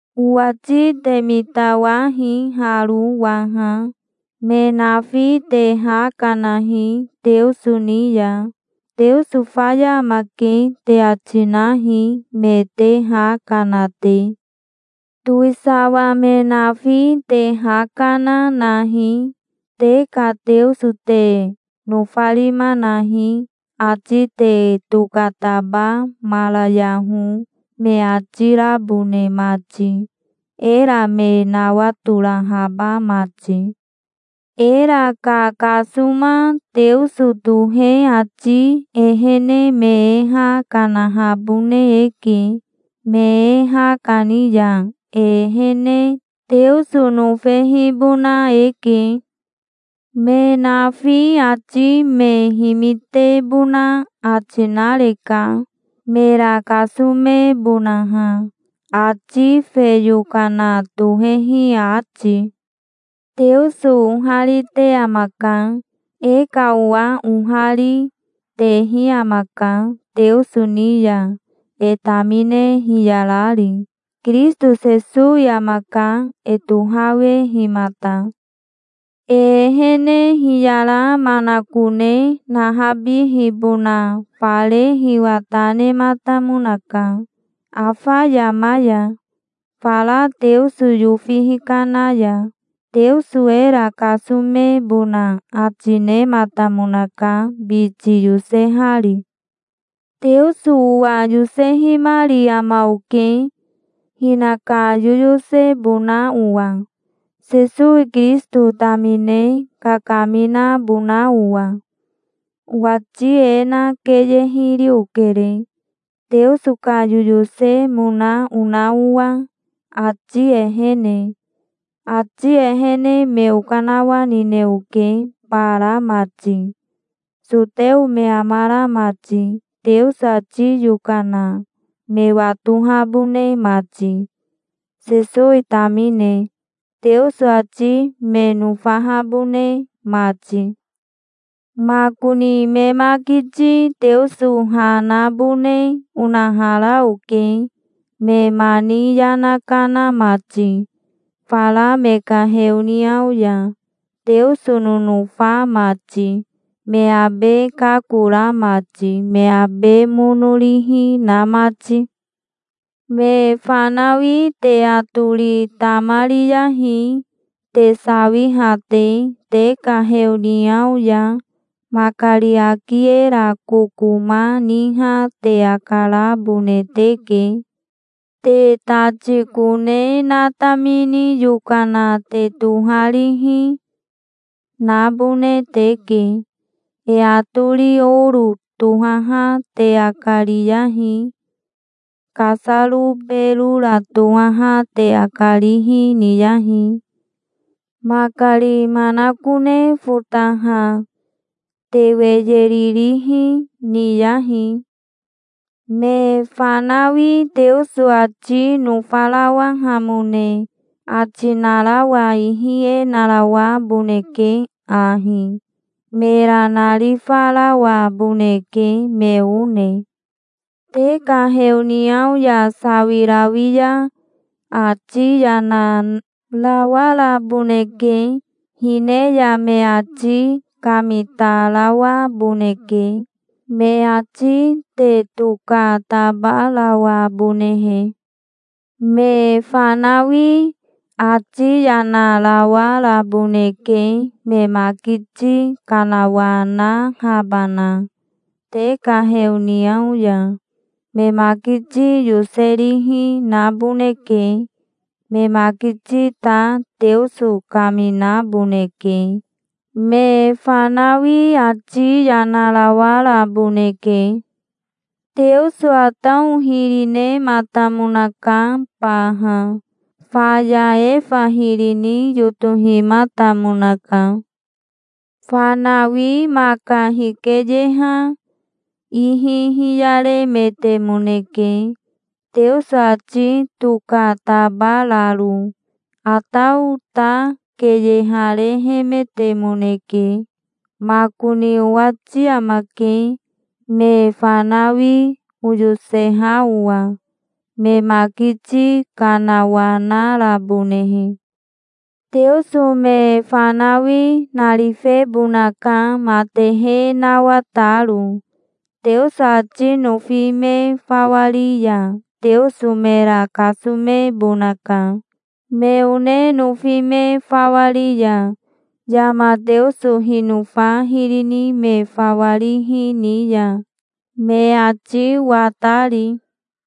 Owati te mitawahi haro waha. Me nafi te ha kanahi, Teoso ni ya. "Teoso faya amake", te ati nahi, me te ha kana te. Towisawa me nafi te ha kana, nahi, "Te ka Teoso te nofarima nahi, ati te tokatabamarayaho", me ati rabone mati, era me nawatorahaba mati. Era kakasoma Teoso tohe ati ehene me e ha kanahabone eke. Me e ha kani ya e ehene Teoso nofehibona eke. Me nafi ati me himitebona ati nareka, mera kasomebonaha, ati fe yokana tohehi ati. Teoso oharite amaka. E ka owa ohari, tehi amaka, Teoso ni ya e tamine hiyarari. Kirisito Sesowi amaka, e tohawehimata. E ehene hiyara manakone nahabihibona fare hiwa ta nematamonaka, afa yama ya, fara Teoso yofi hikana ya. Teoso era kasomebona ati nematamonaka, biti yosehari. Teoso owa yosehimari ama oke, hinaka yoyosebona owa, Sesowi Kirisito tamine kakaminabona owa. Owati e na keye hiri okere, Teoso ka yoyosemona ona owa, ati ehene. Ati ehene me okanawanine oke, bara mati, soteo me amara mati, Teoso ati yokana me watohabone mati, Sesowi tamine, Teoso ati me nofahabone mati. Makoni me makiti Teoso ha nabone onahara oke, me mani yana kana mati, fara me ka heoniao ya, Teoso nonofa mati, me abe kakora mati, me abe mono rihi, na mati. Me fanawi te atori tamariyahi, te sawiha te, te ka heoniao ya. Makari aki era kokoma niha te akarabone teke. Te tati kone natamini yokana te toharihi, nabone teke. E atori oro tohaha te akariyahi. Kasaro berora tohaha te akarihi niyahi. Makari manakone fotaha te weyeri rihi niyahi. Me fanawi Teoso ati nofarawahamone ati narawa ihi e narawaboneke ahi: mera narifarawaboneke, me one. Te ka heoniao ya sawirawi ya ati yana rawaraboneke. Hine ya me ati kamitarawaboneke, me ati tokatabarawabonehe. Me fanawi ati yana rawaraboneke me makiti kanawanahabana te ka heoniao ya. Me makiti yoserihi, naboneke. Me makiti ta Teoso kaminaboneke. Me fanawi ati yana rawaraboneke. Teoso Atao hiri nematamonaka baha. Faya Efa hiri ni yotohimatamonaka. Fanawi maka hikeyeha ihi hiyaremetemoneke, Teoso ati tokatabararo. Atao ta keyeharehemetemoneke. Makoni owati amake, me fanawi oyoseha owa, me makiti kanawanarabonehe. Teoso me fanawi narifebonaka matehe nawataro. Teoso ati nofi me fawa ri ya Teoso mera kasomebonaka, me one nofi me fawa ri ya, yama Teoso hinofa hiri ni me fawa rihi ni ya, me ati watari.